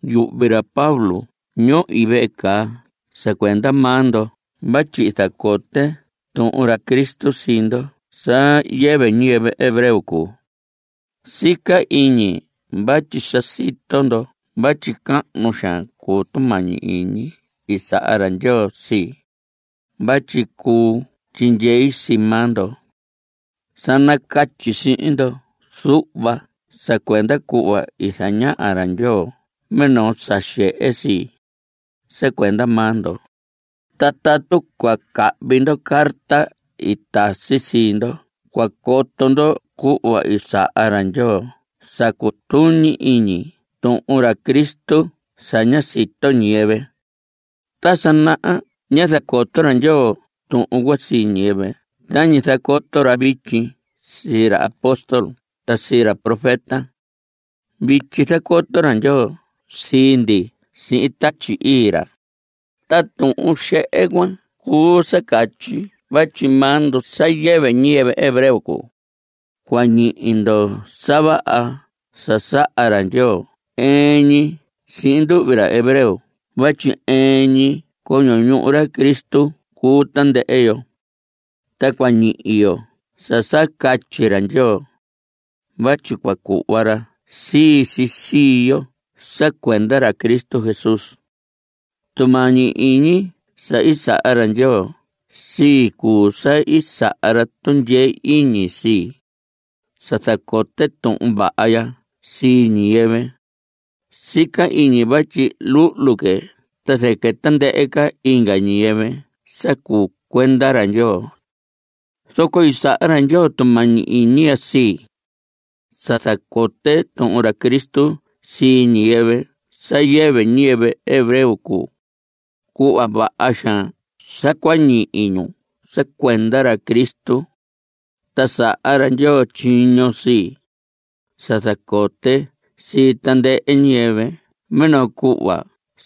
Yuhvi ra Pablo ñohi vehe caa sa cuenda maa ndo vatyi zacote tuhun ra Cristo sii ndoho sa yɨvɨ ñiyɨvɨ hebreo cuu. Sica iñi vatyi sa sito ndo vatyi cahnu xaan cuu tumañi iñi i saha ra Ndyoo sii, vatyi cuu tyindyei sii maa ndo. Sa nacatyi sihin ndo zuhva sa cuenda cuhva i zañaha ra Ndyoo minoo sa xehe sii, sa cuenda maa ndo. Ta tatu cua cahvi ndo carta i tasi sii ndo cua coto ndo cuhva i saha ra Ndyoo sa cutuñi iñi tuhun ra Cristo sa ña sito ñiyɨvɨ. Ta sa naha ñá zacoto ra Ndyoo tuhun cuan sii ñiyɨvɨ tañi zacoto ra vityi sii ra apóstol ta sii ra profeta. Vityi zacoto ra Ndyoo sii ndi sihin Tatyi Ii ra. Ta tuhun xehe cuan cuu sa catyi vatyi maa ndo sa yɨvɨ ñiyɨvɨ hebreo cuu, cua ñihi ndo sa vaha sa saha ra Ndyoo ɨɨn ñi sihin nduhvi ra hebreo vatyi ɨɨn ñi coño ñuhu ra Cristo cuu tandɨhɨ yo. Ta cua ñihi yo sa sa catyi ra Ndyoo, vatyi cua cuhva ra sii si sii yo sa cuenda ra Cristo Jesús. Tumañi iñi sa i saha ra Ndyoo sii, cuu sa i saha ra tundyee iñi sii, sa zacote tuhun vaha ya sii ñiyɨvɨ. Sica iñi vatyi luhlu que ta zɨquɨ tandɨhɨ inga ñiyɨvɨ sa cuu cuenda ra Ndyoo. Zoco i saha ra Ndyoo tumañi iñi ya sii, sa zacote tuhun ra Cristo sii ñiyɨvɨ sa yɨvɨ ñiyɨvɨ hebreo cuu, cuhva vaha xaan sa cua ñihi ñu sa cuenda ra Cristo. Ta saha ra Ndyoo tyiño sii, sa zacote sii tandɨhɨ ñiyɨvɨ minoo cuhva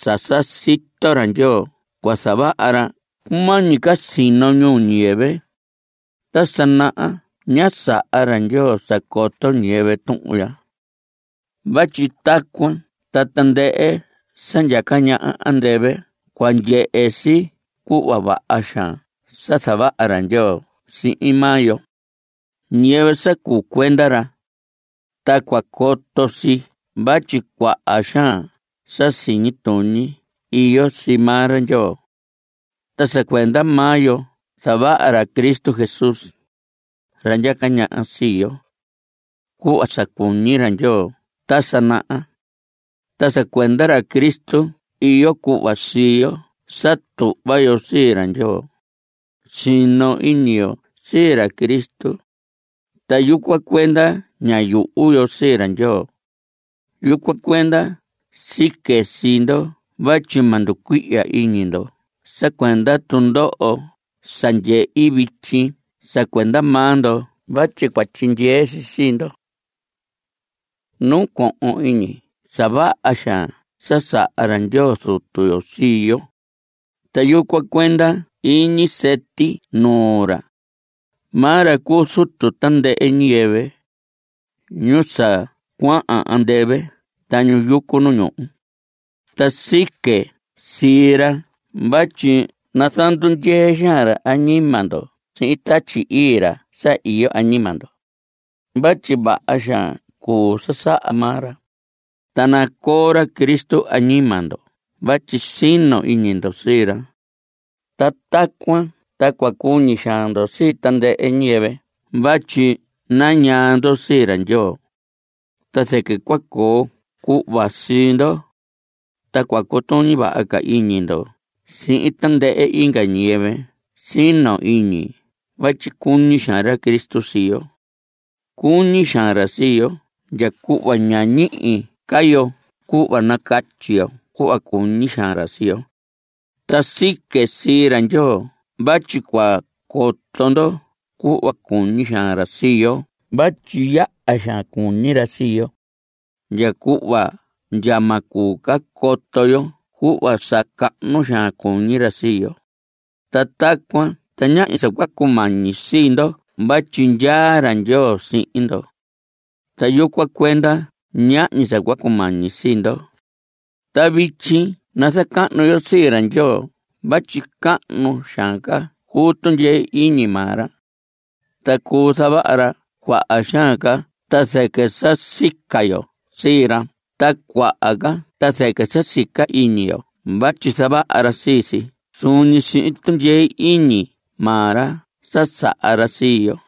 sa sa sito ra Ndyoo cua zavaha ra cumañi ca sino ñuu ñiyɨvɨ. Ta sa naha ñá saha ra Ndyoo sa coto ñiyɨvɨ tuhun ya. Vatyi tacuan ta tandɨhɨ sa ndyaca ñaha andɨvɨ cua ndyehe si cuhva vaha xaan sa zavaha ra Ndyoo sihin maa yo, ñiyɨvɨ sa cuu cuenda ra. Ta cua coto si vatyi cuaha xaan sa siñi tuñi iyo sii maa ra Ndyoo. Ta sa cuenda maa yo zavaha ra Cristo Jesús, ra ndyaca ñaha sii yo, cuhva sa cuñi ra Ndyoo ta sa naha. Ta sa cuenda ra Cristo iyo cuhva sii yo sa tuhva yo sii ra Ndyoo. Sino iñi yo sii ra Cristo, ta yucuan cuenda ña yuhu yo sii ra Ndyoo. Yucuan cuenda sique sii ndo vatyi ma nducuihya iñi ndo sa cuenda tundoho sa ndyehi vityi sa cuenda maa ndo vatyi cua tyindyee si sii ndo. Nacohon iñi sa vaha xaan sa saha ra Ndyoo Zutu yo sii yo, ta yucuan cuenda iñi sɨti nuu ra. Maa ra cuu Zutu tandɨhɨ ñiyɨvɨ, ñu sa cuahan andɨvɨ ta ñu yucu nu ñuhu. Ta sique sii ra vatyi nazandundyee xaan ra añima ndo sihin Tatyi Ii ra sa iyo añima ndo. Vatyi vaha xaan cuu sa saha maa ra. Ta nacoo ra Cristo añima ndo vatyi sino iñi ndo sii ra. Ta tacuan ta cua cuñi xaan ndo sii tandɨhɨ ñiyɨvɨ vatyi nañaa ndo sii ra Ndyoo. Ta zɨquɨ cua coo cuhva sii ndo, ta cua cutuñi vaha iñi ndo sihin tandɨhɨ inga ñiyɨvɨ sino iñi vatyi cuñi xaan ra Cristo sii yo. Cuñi xaan ra sii yo ndya cuhva ña ñihi ca yo cuhva nacatyi yo cuhva cuñi xaan ra sii yo. Ta sique sii ra Ndyoo vatyi cua coto ndo cuhva cuñi xaan ra sii yo vatyi yaha xaan cuñi ra sii yo, ndya cuhva ndya ma cuu coto yo cuhva sa cahnu xaan cuñi ra sii yo. Ta tacuan ta ñahñi sa cua cumañi sii ndo vatyi ndyaa ra Ndyoo sihin ndo. Ta yucuan cuenda ñahñi sa cua cumañi sii ndo. Ta vityi nazacahnu yo sii ra Ndyoo vatyi cahnu xaan ca cuu tundyee iñi maa ra, ta cuu zavaha ra cuaha xaan ca ta zɨquɨ sa sica yo sii ra ta cuaha ca ta zɨquɨ sa sica iñi yo vatyi zavaha ra sii si zuun ñi sihin tundyee iñi maa ra sa saha ra sii yo.